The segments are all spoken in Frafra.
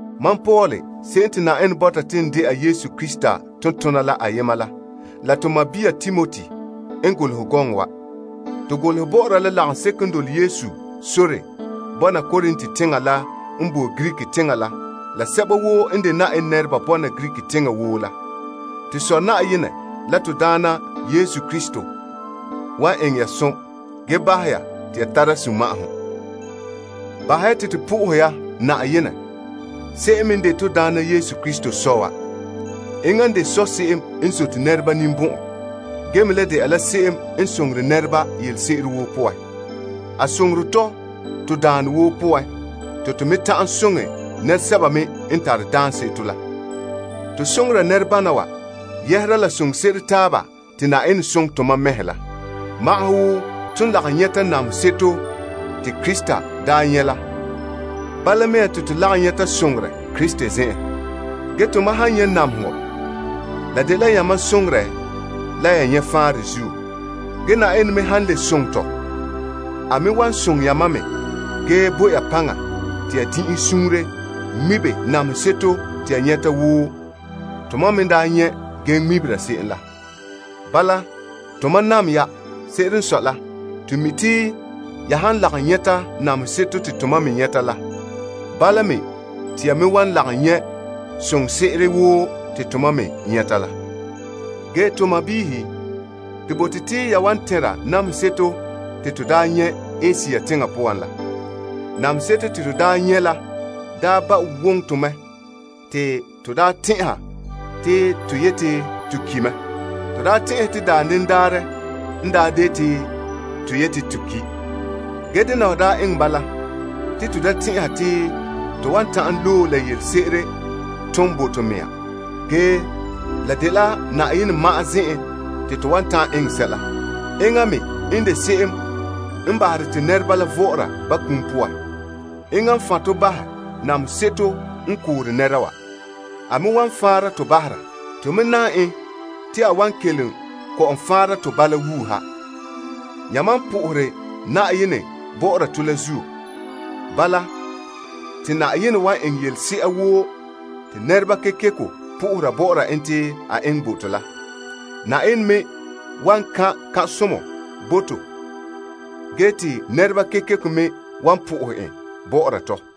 Mam Paul se'em te Na'ayenɛ bɔta te n dɛna Yesu Krista tontoneba la ayema la la to sɔɔn Timoti n golehɛ gɔŋɔ wa. To golehɛ bɔ'ɔra la lagaŋseko n dole Yesu sore bɔna Korint teŋa la n boe Greek teŋa la la sɛba woo n de Na'ayenɛ nɛreba bɔna Greek teŋa woo la. To Sɔ' Na'ayenɛ la to Daana Yesu Krista wan eŋɛ ya som ge bahɛ ya te ya tara sunma'ahom. Bahɛ ya te to po'ohɛ ya Na'ayenɛ se'em n me de to Daana Yesu Krista Sɔ' wa. Enŋa n de Sɔ' se'em n zote nɛreba ninbɔn'ɔn ge me le dɛna la se'em n soŋore nɛreba yelese'ere woo poan. A soŋore tɔ to daanɔ woo poan te to me ta'an soŋɛ nɛresɛba me n tara daanseto la. To soŋore nɛrebana wa yɛhera la soŋse'ere taaba te Na'ayenɛ soŋɛ tomam mɛhe la. Wo ton lagom nyɛta namehe seto te Krista daa nyɛ la, bala me te to lagom nyɛta soŋorɛ Krista zen'en. Ge tomam han nyɛ namehegɔ, la dela yamam soŋorɛ la ya nyɛ faanrɛ zuo. Ge Na'ayenɛ me han soŋɛ tɔ, la wan soŋɛ yamam me ge bo ya paŋa te ya din'inhe suunre ŋmibe namehe seto te ya nyɛta wo tomam me n daa nyɛ ge ŋmebere se'em la. Bala, bahɛ te tomam n tare potɛn'se'ere bɔ'ɔra ya la zin'ire me soŋa. Se'ere n sɔe la, to mi te ya han lagom nyɛta namehe seto te tomam me nyɛta la, bala me te ya me wan lagom nyɛ soŋse'ere woo te tomam me nyɛta la. Gee to sɔɔnrɔ, to bote te ya wan tɛnra namehe seto te to daa nyɛ Asia teŋa poan la. Namehe seto te to daa nyɛ la daa ba woŋɛ to mɛ te to daa tɛn'ɛha te to yeti to ki mɛ. To daa tɛn'ɛhe te daanden daarɛ n daa de te to yeti to ki. Ge dena wa daa eŋɛ bala te to da delom to mɛhe ge to dɛla Na'ayenɛ. Enŋa n de se'em n bahere te nɛreba vɔ'ɔra ba kum poan. Enŋa n faanre to namehe seto la n daa yeti to ko tɔ la poan bahɛ. A me wan faanra to bahera. To me nam en te a wan kelom kɔ'ɔn faanra to bala wuuha, yamam n sohore Yenɛ bɔ'ɔra to la zuo. Bala, te Yenɛ wan eŋɛ yelese'a woo te nɛreba kekeko po'ohera bɔ'ɔra en te a eŋɛ bo to la. Yenɛ me wan eta to som ge te nɛreba kekeko me wan pɛngera en bɔ'ɔra tɔ.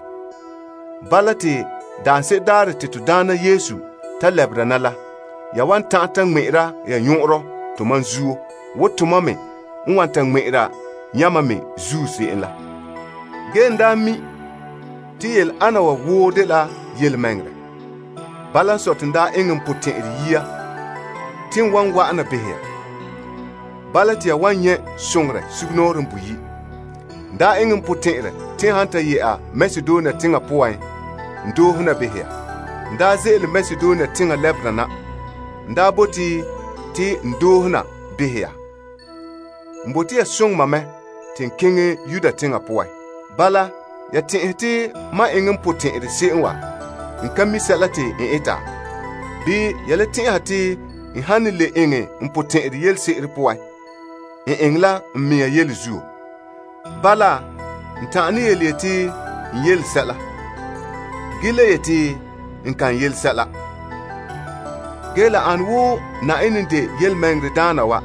te sɛla te ya bɔkɛ nananawa dela fiin wa. Bala te daanse'ere daarɛ te to Daana Yesu ta lɛbera na la, ya wan tara tomam ŋmɛ'ɛra ya nyɔn'ɔnrɔ te tomam me tara yamam ŋmɛ'ɛra nyɔn'ɔnrɔ. Gee n daa mi' te yele ana wa woo dela yelemɛŋɛrɛ. Bala n sɔe te n daa eŋɛ n potɛn'ɛrɛ yia te wan wa'ana behɛ ya. Bala te ya wan nyɛ' soŋorɛ sugumnɔɔren boyi'. N daa eŋɛ n potɛn'ɛrɛ te n han ta yɛ'a Makedonia teŋa poan, n doohe na behɛ ya. N daa ze'ele Makedonia teŋa lɛbera na, n daa bote te n doohe na behɛ ya. N bote ya soŋɛ mam mɛ te n keŋɛ Yudea teŋa poan. Bala, ya tɛn'ɛhe te mam eŋɛ n potɛn'ɛrɛ se'em wa, n ka mi sɛla te n eta? Bii ya le tɛn'ɛha te n han ne le eŋɛ n potɛn'ɛrɛ yelese'ere poan, n eŋɛ la n mea yele zuo? Bala, n ta'an ne yeti, Ɛɛn, la dela ɛɛn. Ge le yeti, Aai, la dela aai. Ge Na'ayenɛ n de yelemɛŋɛrɛdaana wa,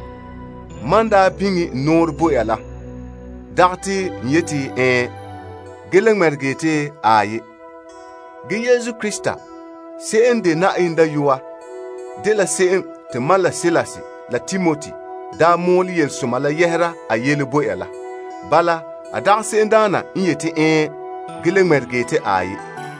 mam n daa biŋe n nɔɔrɛ bo ya, la dagɛ te n yeti, Ɛɛn, Ge le ŋmɛregɛ yeti, Aai. Yesu Krista se'em n de Na'ayenɛ Dayɔa dela se'em te mam la Silas la Timoti daa mɔɔlɛ Yelesoma la yɛhera a yele bo ya la. Bala, a dagɛ se'emdaana n yeti, Ɛɛn Ge le ŋmɛregɛ yeti, Aai.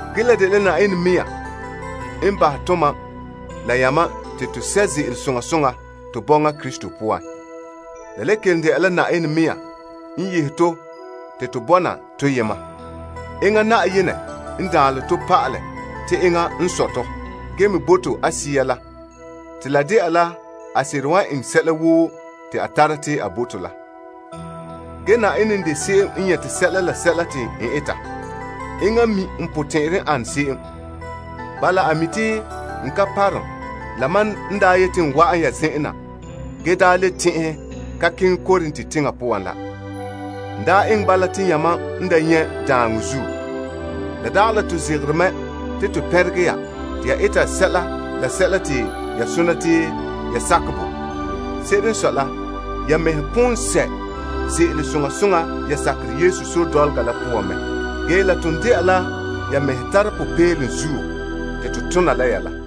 Ge la dela Na'ayenɛ mea n bahɛ tomam la yamam te to sɛ' ze'ele soŋa soŋa to bɔŋa Krista poan. La le kelom dɛna la Na'ayenɛ mea n yehe to te to bɔna toyema. Enŋa Na'ayenɛ n daanlɛ tɔ pa'ala te enŋa n sɔe tɔ ge me bo to a Sea la te la dɛna la a seren wan eŋɛ sɛla woo te a tara te a bo to la. Ge Na'ayenɛ n de se'em n nyɛte sɛla la sɛla te n eta. Enŋa n mi n potɛn'ɛrɛ n an se'em. Bala a mi' te n ka parom la mam n daa yete n wa'an ya zen'en na ge daa le tɛn'ɛhɛ ka keŋɛ Korint teŋa poan la. N daa eŋɛ bala te yamam n da nyɛ' daaŋɔ zuo. La dagɛ la to zegere mɛ te to pɛnregɛ ya te ya sakɛ sɛla la sɛla te ya sona te ya sakɛ bo. Se'ere n sɔe la, ya mɛhe pon sɛ' ze'ele soŋa soŋa ya sakerɛ Yesu sore dɔlɔga la poan la mɛ. Ge la ton dɛna la ya mɛhe tara popeelom zuo te to tona la ya la.